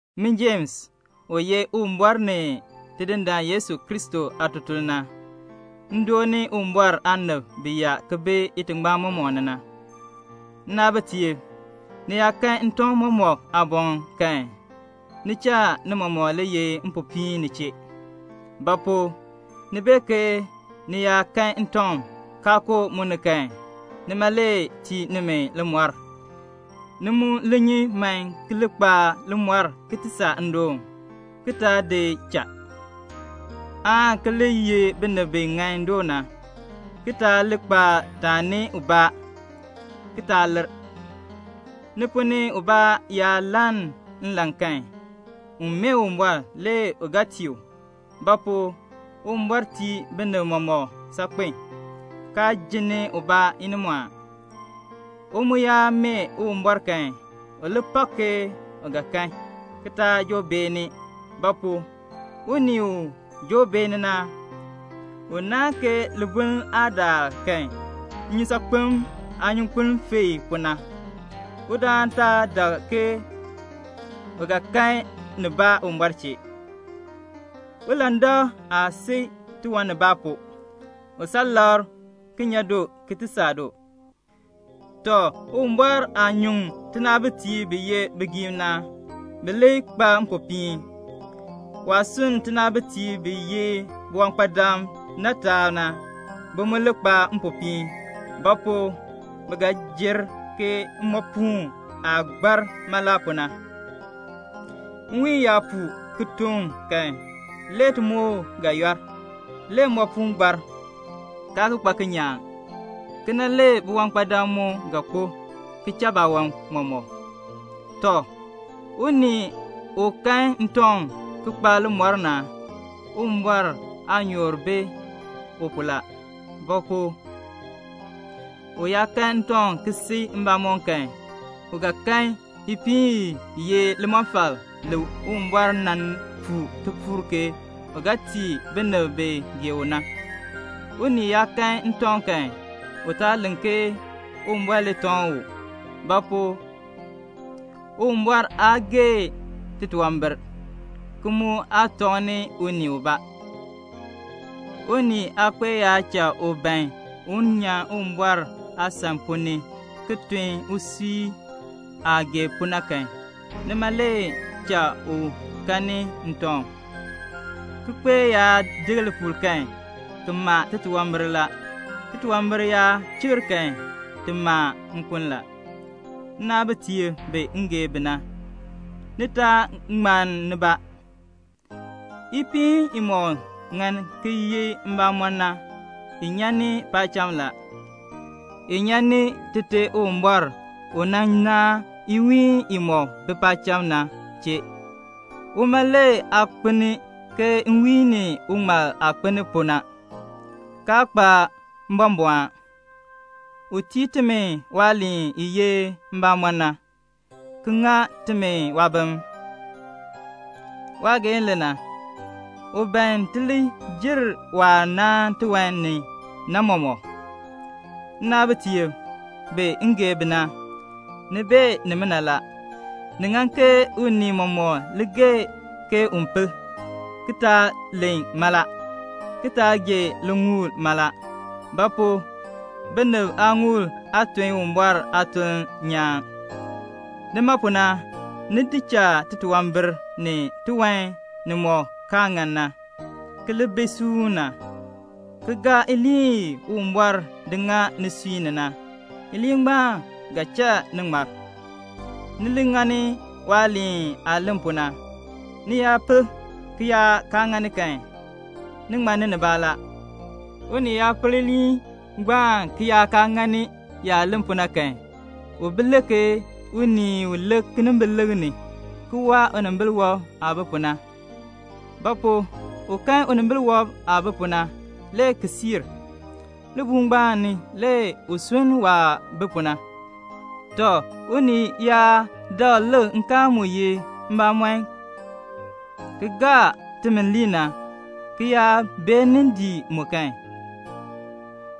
Min Jems, u ye Uwumbɔr ni Tidindaan Yesu Kristo aatutuln na, m dooni Uwumbɔr aanib bi yaa ki bi itingbaan mɔmɔk ni na. Nnaabitiib, ni yaa kan ntɔŋ mɔmɔk aaboŋ kan, ni cha ni mɔmɔk li ye mpopiin ni chee. Ba pu? ni bee ke ni yaa kan ntɔŋ, kaa koo mu ni kan, nima le tii nimi limɔr. Ni mu li nyi man ki li kpa limɔr ki ti saa naadoon, ki taa di cha, aan ki li ye binib bi ŋan doo na, ki taa li kpa taani ubaa, ki taa lir. Ni ponn ni ubaa yaa lann nlan kan, un mee Uwumbɔr, le u ga tii u; ba pu? Uwumbɔr tii binib mɔmɔk saakpen, kaa jinni ubaa inimɔɔn. U mu yaa mee Uwumbɔr kan, u li pak ke u ga kan, ki taa joo beeni; ba pu? unii u joo beeni na, u naahn ke libuln aah daar kan, nnyusaakpem aanyunkpuŋ feei pu na. Udaan taa dak ke u ga kan nibaa Uwumbɔr chee. Ulandak aa si tiwanbaan pu, u saa labr, ki nya du, ki ti saa du. Tɔ, Uwumbɔr aah nyuŋ tinaabitiib bi ye bigiim na, bi li kpa mpopiin. Waah sunn tinaabitiib bi ye biwankpadam na taab na, bi mu li kpa mpopiin; ba pu? bi ga jer ke mmoopuun aah gbaar mala pu na. Nwiin yaa puu ki toŋ kan, le timoor ga yɔl, le mmoopuun gbaar, kaa ki kpa kinyaan. Kena le biwankpadam mu ga kpo, ki cha baawan mɔmɔk. Tɔ, unii u kan ntɔŋ ki kpa limɔr na, Uwumbɔr aanyoor bi u pu la. Ba pu? u yaa kan ntɔŋ ki si mbamɔm kan, u ga kan ipiin i ye limɔfal li Uwumbɔr nan puu tipuul ke u ga tii binib bi gee u na. Unii yaa kan ntɔŋ kan, u taa len ke Uwumbɔr le tɔŋ u; ba pu? Uwumbɔr aa gee titunwambir, ki mu aa tɔŋni unii ubaa. Unii aakpeek yaa cha u ban un nyan Uwumbɔr aasan ponn ni ki tun usui aah gee pu na kan, nima le cha u kanni ntɔŋ. Kikpeek yaa dek lipuul kan, ki ma titunwambir la; titunwambir yaa chikr kan, ti ma nkun la. Nnaabitiib bi m gee bi na, ni taa ŋmann nibaa. Ipiin imɔk ŋan ki ye mbamɔm na, i nyan ni paacham la. I nyan ni Tite Uwumbɔr u nan naan iwiihn imɔk bi paacham na chee. Uma le aa kpelni ke nwiin ni uŋmal aah kpelni pu na, kaa kpa mbɔmbɔɔn. U tii timi waaliin i ye mbamɔn na, ki ŋa timi waabim. Waageehn le na. U ban ti li jer waah naan tiwan ni na mɔmɔk. Nnaabitiib bi m gee bi na, ni bee nimina la. Ni ŋan ke unii mɔmɔk gee ke un pel, ki taa len mala, ki taa gee liŋuul mala; ba pu? binib aaŋuul aa tun Uwumbɔr aatuln nyaan. Nima pu na, ni di cha titunwambir ni tiwan nimɔk kaa ŋan na, ki li bi suuna, ki gaa iliin i Uwumbɔr di ŋa nisui ni na; iliin ngbaan ga cha ni ŋmar. Ni li ŋani waaliin aah len pu na. Ni yaa pel, ki yaa kaa ŋani kan, ni ŋmanni nibaa la. Unii yaa pel iliin ngbaan ki yaa kaa ŋani yaah len pu na kan, u bi le ke unii u lik kinimbilikr ni, ki waa unimbil wɔb aah bi pu na. Ba pu? u kan unimbil wɔb aah bi pu na, le ki siir. Libuul ngbaan ni le u sunn waah bi pu na. Tɔ, unii yaa dakl lik nkaal mu ye mbamɔm ki gaa timi lii na, ki yaa beenin dii mu kan,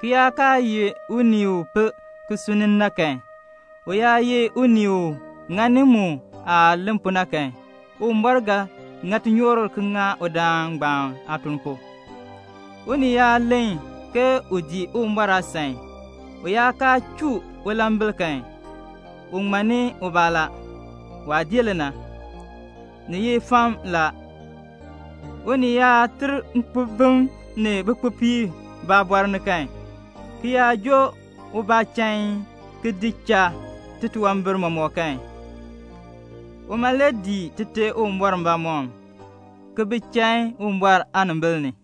ki yaa kaa ye unii u pel ki sunn na kan, u yaa ye unii u ŋani mu aah len pu na kan, Uwumbɔr ga ŋa tinyoor ki ŋa udaan ngbaan aatuln pu. Unii yaa len ke u dii Uwumbɔr aasan, u yaa kaa chuu ulambil kan, u ŋmanni ubaa la. Waa dii le na. Ni ye fam la. Unii yaa ter nkpobim ni bikpopiib baabɔr ni kan, ki yaa joo ubaa chain, ki di cha titunwambir mɔmɔk kan, uma le dii Tite Uwumbɔr mbamɔm, ki bi chain Uwumbɔr aanimbil ni.